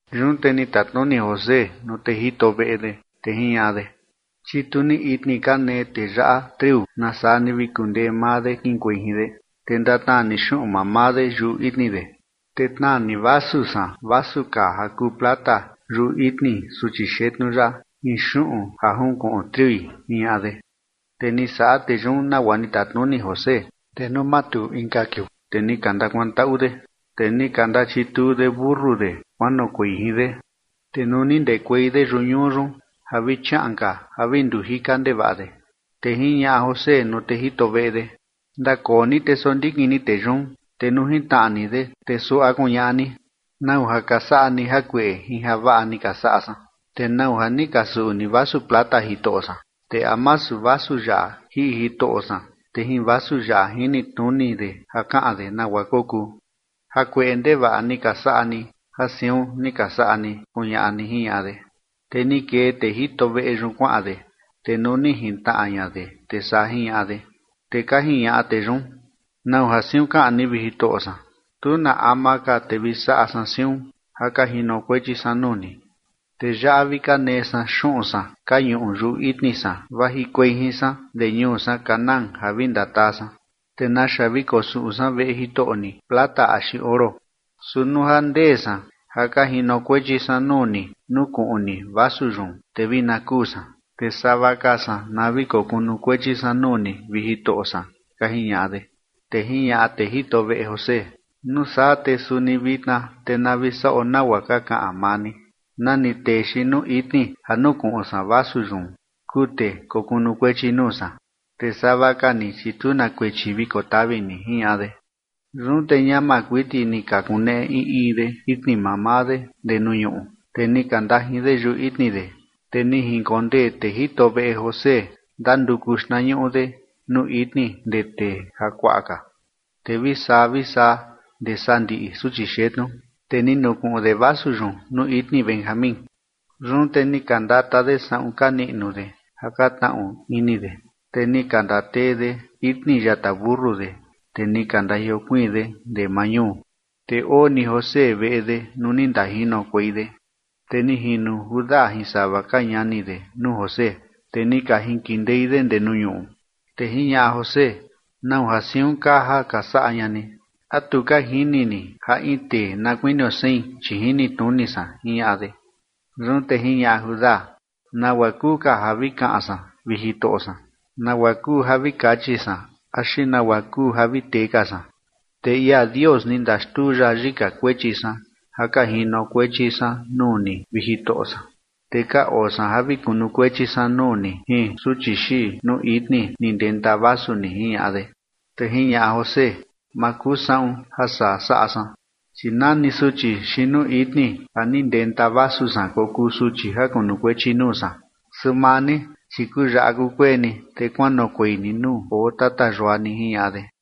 Yun te ni tatnuni José nuu tee jito veꞌe de, te jiñaꞌa de: ―Chitu ni itni ka nee tee yaꞌa triu nasaa ni vi kundee maa de kiꞌinkuei jin de, te ndatnaa ni xuꞌun mamaa de yuꞌu itni de. Te tnaa ni vasu san, vasu kaa ja kuu plata yuꞌu itni suchi xetnu yaꞌa jin xuꞌun ja junkuꞌun triui ―jiñaꞌa de. Te ni saꞌa tee yun nagua ni tatnuni José. Te nuu matuu inka kiuu, te ni ka ndakuantaꞌu de, te ni ka ndachituu de mentu de kuanoꞌokuei jin de. Te nuu ni ndekuei de yuꞌu ñuu yun ja vi chiaꞌan ka ja vi ndujika ndevaꞌa de, te jiñaꞌa José nuu tee jito veꞌe de: ―Ndakoo ni te sondikin ni tee yun, te nuu jintnaꞌa ni de, te suaꞌa kuñaꞌa ni: “¿Nau ja ka saꞌa ni jakueꞌe jin javaꞌa ni ka saꞌa san? ¿Te nau ja ni ka suꞌu ni vasu plata jitoꞌo san? ¿Te a masu vasu yaꞌa jiꞌi jitoꞌo san, te jin vasu yaꞌa jinitnuni de ja kaꞌan de nagua kokuu? Jakueꞌe ndevaꞌa ni ka saꞌa ni ja siun ni ka saꞌa ni”, kuñaꞌa ni ―jiñaꞌa de. Te ni kee tee jito veꞌe yun kuaꞌan de, te nuu ni jintnaꞌa ña de, te saa jiñaꞌa de. Te ka jiñaꞌa tee yun: ―¿Nau ja siun kaꞌan ni, vi jitoꞌo san? Tu na ama ka te vi saꞌa san siun, ja ka jinokuechi san nuu ni. Te yaꞌa vi ka nee san xuꞌun san ka ñuꞌu yuꞌu itni san vajikuei jin san ndee ñuu san Canaán ja vi ndataa san. ¿Te naxa vi kosuꞌu san veꞌe jitoꞌo ni plata axi oro? Su nuu ja ndee san ja ka jinokuechi san nuu ni nukuꞌun ni vasu yun, te vi na kuu san, te sava ka san na vi kokunukuechi san nuu ni, vi jitoꞌo san ―ka jiñaꞌa de. Te jiñaꞌa tee jito veꞌe José: ―Nuu saa te suni vitna te na vi saꞌo nagua ka kaꞌan maa ni. Na ni tee xiin nuu itni ja nukuꞌun san vasu yun kuu tee kokunukuechi nuu san, te sava ka ni, chi tu na kuechi vi kotavi ni ―jiñaꞌa de. Yun te ñama kuiti ni ka kuneꞌe in in de itni mamaa de ndee nuu ñuꞌu, te ni ka ndajin de yuꞌu itni de. Te ni jinkondee tee jito veꞌe José ndanduku xtnañuꞌu de nuu itni ndee tee jakuaꞌa ka, te vi saa vi saa ndee sandiꞌi suchi xetnu, te ni nukuꞌun de vasu yun nuu itni Benjamín. Yun te ni ka ndata de saꞌun ka niꞌnu de ja ka tnaꞌu ini de, te ni ka ndatee de itni yata mentu de, te ni ka ndajiokuiin de ndee maa ñuu. Te oo ni José veꞌe de nuu ni ndajinokuei de, te ni jino Judá jin sava ka ñani de nuu José, te ni ka jinkindei de ndee nuu ñuꞌu. Te jiñaꞌa José: ―¿Nau ja siun kaa ja ka saꞌa ña ni? ¿A tu ka jini ni ja in tee na kuinio sein, chi jinitnuni san? ―jiñaꞌa de. Yun te jiñaꞌa Judá: ―¿Nagua kuu ka ja vi kaꞌan san, vi jitoꞌo san? ¿Nagua kuu ja vi kachi san axi nagua kuu ja vi tee ka san? Te ia Dios ni ndaxtuu ya yika kuechi san ja ka jinokuechi san nuu ni, vi jitoꞌo san, te ka oo san ja vi kunukuechi san nuu ni jin suchi xiin nuu itni ni ndenta vasu ni ―jiñaꞌa de. Te jiñaꞌa José: ―Ma kuu saꞌun ja saa saꞌa san, chi na ni suchi xiin nuu itni ja ni ndenta vasu san kokuu suchi ja kunukuechi nuu san. Su maa ni, chi kuyaꞌa kukueni, te kuanoꞌokuei ni nuu oo tata yua ni ―jiñaꞌa de.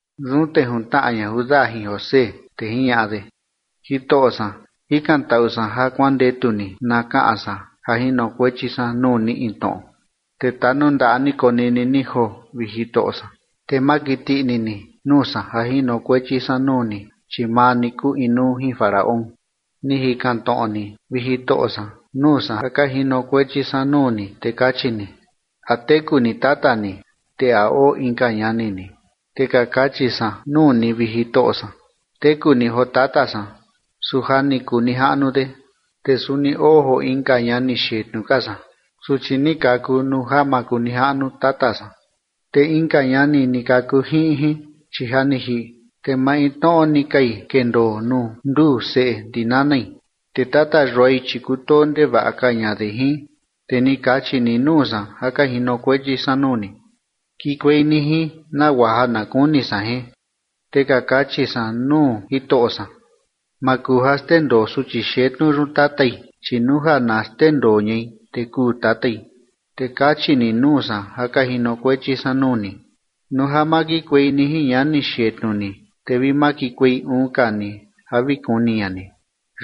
Yun te juntnaꞌa ña Judá jin José, te jiñaꞌa de: ―Jitoꞌo san, jikantaꞌu san ja kuandetu ni na kaꞌan san ja jinokuechi san nuu ni in tnoꞌo, te tanundaꞌa ni konini ni joo, vi jitoꞌo san, te ma kiti ini ni nuu san ja jinokuechi san nuu ni, chi maa ni kuu inuu jin Faraón. Ni jikan tnoꞌo ni, vi jitoꞌo san, nuu san ja ka jinokuechi san nuu ni, te kachi ni: “¿A teku ni tata ni, te a oo inka ñani ni?” Te ka kachi san nuu ni, vi jitoꞌo san: “Teku ni joo tata san, su ja ni kuu nijaꞌnu de, te suni oo joo inka ñani xetnu ka san, suchi ni kaku nuu ja makunijaꞌnu tata san, te inka ñani ni kaku jiꞌin jin, chi ja ni jiꞌi, te maintnoꞌo ni kai kendoo nuu nduu seꞌe ndi nanai, te tata yuai, chi kutoo ndevaꞌa ka ña de jin”. Te ni kachi ni nuu san ja ka jinokuechi san nuu ni: “Kikuei ni jin nagua ja na kuni san jin”. Te ka kachi san nuu jitoꞌo san: “Ma kuu ja xndendoo suchi xetnu yun tatai, chi nuu ja na xndendoo ñai, te kuu tatai”. Te kachi ni nuu san ja ka jinokuechi san nuu ni: “Nuu ja ma kikuei ni jin ñani xetnu ni, te vi ma kikuei uun ka ni ja vi kuni ña ni”.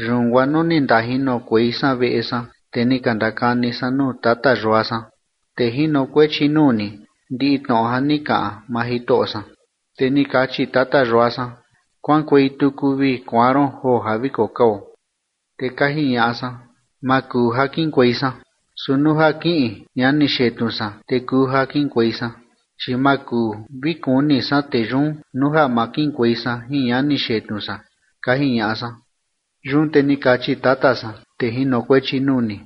Yun guaa nuu ni ndajinokuei san veꞌe san, te ni ka ndakani san nuu tata yua san, tee jinokuechi nuu ni, ndiꞌi tnoꞌo ja ni kaꞌan maa jitoꞌo san. Te ni kachi tata yua san: “Kuaꞌankuei tuku vi kuaan ron joo ja vi kokao”. Te ka jiñaꞌa san: “Ma kuu ja kiꞌinkuei san, su nuu ja kiꞌin ñani xetnu san, te kuu ja kiꞌinkuei san, chi ma kuu vi kuni san tee yun nuu ja ma kiꞌinkuei san jin ñani xetnu san”, ka jiñaꞌa san. Yun te ni kachi tata san, tee jinokuechi nuu ni: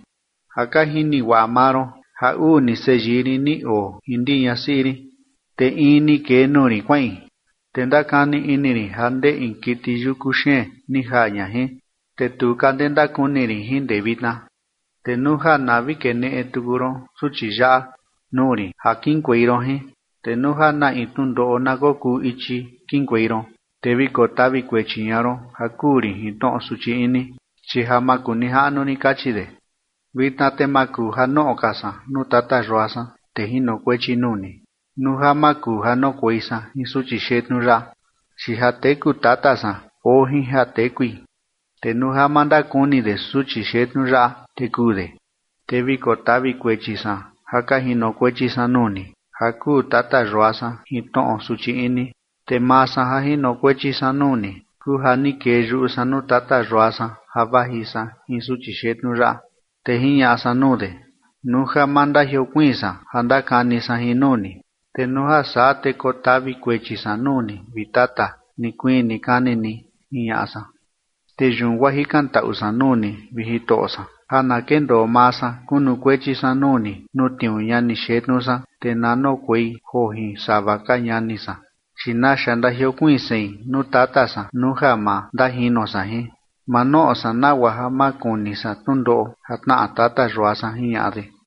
“Ja ka jini guaꞌa maa ron ja uu ni seyii rin ni oo jin ndi ñasiꞌi rin. Te in ni kee nuu rin kuaꞌin, te ndakani ini rin ja ndee in kiti yuku xeen ni jaa ña jin, te tu ka ndee ndakuni rin jin ndee vitna. Te nuu ja na vi keneꞌe tuku ron suchi yaꞌa nuu rin ja kiꞌinkuei ron jin, te nuu ja na in tnundoꞌo na kokuu ichi kiꞌinkuei ron, te vi kotavi kuechi ña ron ja kuu rin jin tnoꞌo suchi ini, chi ja makunijaꞌnu rin” kachi de. Vitna te ma kuu ja noꞌo ka san nuu tata yua san, tee jinokuechi nuu ni, nuu ja ma kuu ja noꞌokuei san jin suchi xetnu yaꞌa, chi ja teku tata san oo jin ja tekui. Te nuu ja ma ndakuni de suchi xetnu yaꞌa, te kuu de, te vi kotavi kuechi san ja ka jinokuechi san nuu ni, ja kuu tata yua san jin tnoꞌo suchi ini. Te maa san ja jinokuechi san nuu ni, kuu ja ni kee yuꞌu san nuu tata yua san ja vaji san jin suchi xetnu yaꞌa, te jiñaꞌa san nuu de: “Nuu ja ma ndajiokuiin san ja ndakani san jin nuu ni, te nuu ja saa te kotavi kuechi san nuu ni, vi tata, nikuii nikani ni”, jiñaꞌa san. Te yun guaa jikantaꞌu san nuu ni, vi jitoꞌo san, ja na kendoo maa san kunukuechi san nuu ni, nuu tniuu ñani xetnu san, te na noꞌokuei joo jin sava ka ñani san, chi ¿naxa ndajiokuiin sein nuu tata san nuu ja ma ndajino san jin? Ma noꞌo san nagua ja ma kuni san tnundoꞌo ja tnaꞌa tata yua san ―jiñaꞌa de.